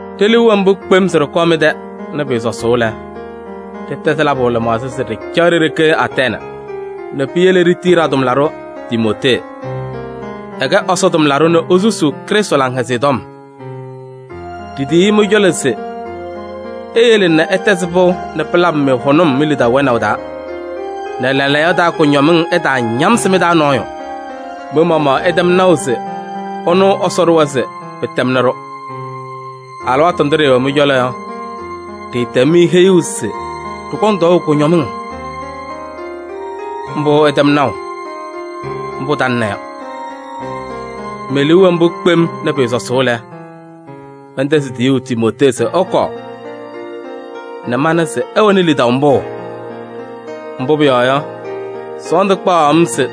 Ɖe-liu wɛ mbʋ kpem se ɖɩkɔɔ mɩ-tɛ nɛ pɩɩsɔsʋʋ lɛ, ɖɩtɛzɩ labʋ lɩmaɣza se ɖɩcaɣ ɖe-ɖeke Atɛɛnɩ nɛ piyele ɖitiyi ɖa-tʋmlaɖʋ Timootee. Ɛkɛ Ɛsɔ tʋmlaɖʋ nɛ esusuu Krɩstʋ Laŋhɛzɩyɛ Tɔm. Ɖitiyi-i mɩ-cɔlɔ se eyele nɛ ɩtɛzɩ pɩʋ nɛ pɩlabɩ-mɩ hʋnʋm mi-lidaʋ wɛnaʋ taa nɛ lɛɛlɛɛyɔ taa kʋñɔmɩŋ ɛtaañamsɩ mɩ-taa nɔɔyʋ. Mɩ-maɣmaɣ ɩtɛm naʋ se ɩnʋ Ɛsɔ ɖʋwa se pɩtɛmnɩ-ɖʋ. Alɩwaatʋ ndʋ ɖɩɩwɛ mɩ-cɔlɔ yɔ, ɖɩɩtɛm-mɩ heyuu se ɖɩkɔŋ tɔɔʋ kʋñɔmɩŋ. Mbʋ ɩtɛm naʋ, mbʋ talɩna yɔ. Me-liu wɛ mbʋ kpem nɛ pɩɩsɔsʋʋ lɛ, mɛntɛzɩ tiyuu Timootee se ɛkɔɔ nɛ mana se ɩwɛnɩ lidaʋ mbʋ? Mbʋ pʋyɔɔ yɔ, sɔɔndʋ kpaɣaɣ-m se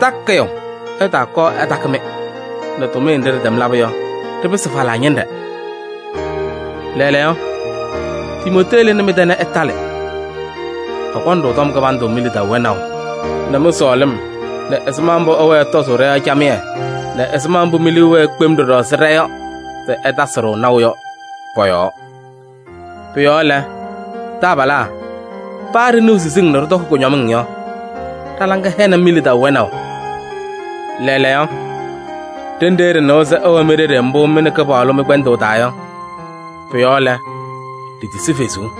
takɩyʋ ɛtaakɔɔ ɛtakɩ-mɩ nɛ tʋmɩyɛ nɖɩ ɖɩlaba yɔ, ɖɩpɩsɩ falaa ñɩnɖɛ. Lɛɛlɛɛyɔ, Timootee lɩnɩ mɩ-tɛ nɛ ɛtalɩ. Ɛkɔnɩ-ɖʋ tɔm kɩbandʋ mi-lidaʋ wɛnaʋ nɛ mɩ-sɔɔlɩm nɛ ɛzɩma mbʋ ɩwɛɛ ɩtɔzʋʋ ɖɔ-yɔɔ camɩyɛ nɛ ɛzɩma mbʋ mi-liu wɛɛ kpem ɖɔɖɔ ɛzɩ ɖa yɔ se ɩtasɩ-ɖʋ naʋ yɔ pɔ-yɔɔ. Pʋ-yɔɔ lɛ, taabalaa, paa ɖɩnɩɣ siziŋ nɛ ɖɩtɔkɩ kʋñɔmɩŋ yɔ, ɖa-laŋɩyɛ hɛnɩ-mɩ mi-lidaʋ wɛnaʋ yɔɔ. Lɛɛlɛɛyɔ, ɖenɖe ɖɩnɩwa se ɩwɛ mi-ɖeɖe mbʋ mɩ nɛ Kɩpaɣlʋ mɩ-kpɛndʋʋ taa yɔ, pʋ-yɔɔ lɛ, ɖitisi fezuu.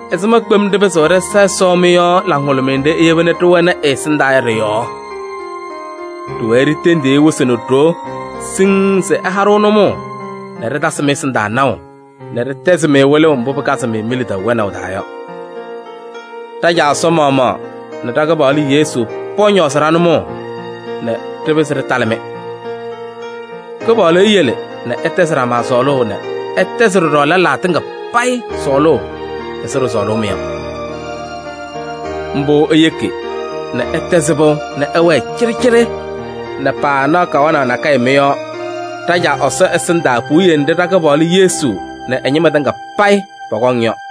Ɛzɩma kpem ɖɩpɩzɩɣ ɖɩsa Ɛsɔ mɩ-yɔɔ laŋhʋlʋmɩyɛ nɖɩ iyeba nɛ ɖɩwɛnɩ ɛ-ɛsɩndaa yɔ ɖɩ-yɔɔ? Ɖɩwɛɛ ɖitendiɣ-i wɩsɩ nɛ ɖoo siŋŋ se ɛha-ɖʋ nʋmɔʋ nɛ ɖɩtasɩ mɩ-ɛsɩndaa naʋ nɛ ɖɩtɛzɩ-mɩ wɩlʋʋ mbʋ pɩkazɩ-mɩ mi-lidaʋ wɛnaʋ taa yɔ. Ɖa-Caa Ɛsɔ maɣmaɣ nɛ ɖa-Kɩpaɣlʋ Yesu pɔñɔɔzɩ ɖa-nʋmɔʋ nɛ ɖɩpɩzɩ ɖɩtalɩ-mɩ! Kɩpaɣlʋ eyele nɛ ɩtɛzɩ ɖama sɔɔlʋʋ nɛ ɩtɛzɩ ɖɔɖɔ lɛlaa tɩŋa payɩ sɔɔlʋʋ ɛzɩ ɖɩsɔɔlʋʋ-mɩ yɔ. Mbʋ eyeki nɛ ɩtɛzɩ pɩʋ nɛ ɩwɛɛ cɩɖɩcɩɖɩ nɛ paanaɣ kawanaɣ nakɛyɛ mɩ-yɔɔ ɖa-Caa Ɛsɔ ɛsɩndaa puwiye nɖɩ ɖa-Kɩpaɣlʋ Yesu nɛ ɛ-ñɩma tɩŋa payɩ pɔkɔŋ yɔ.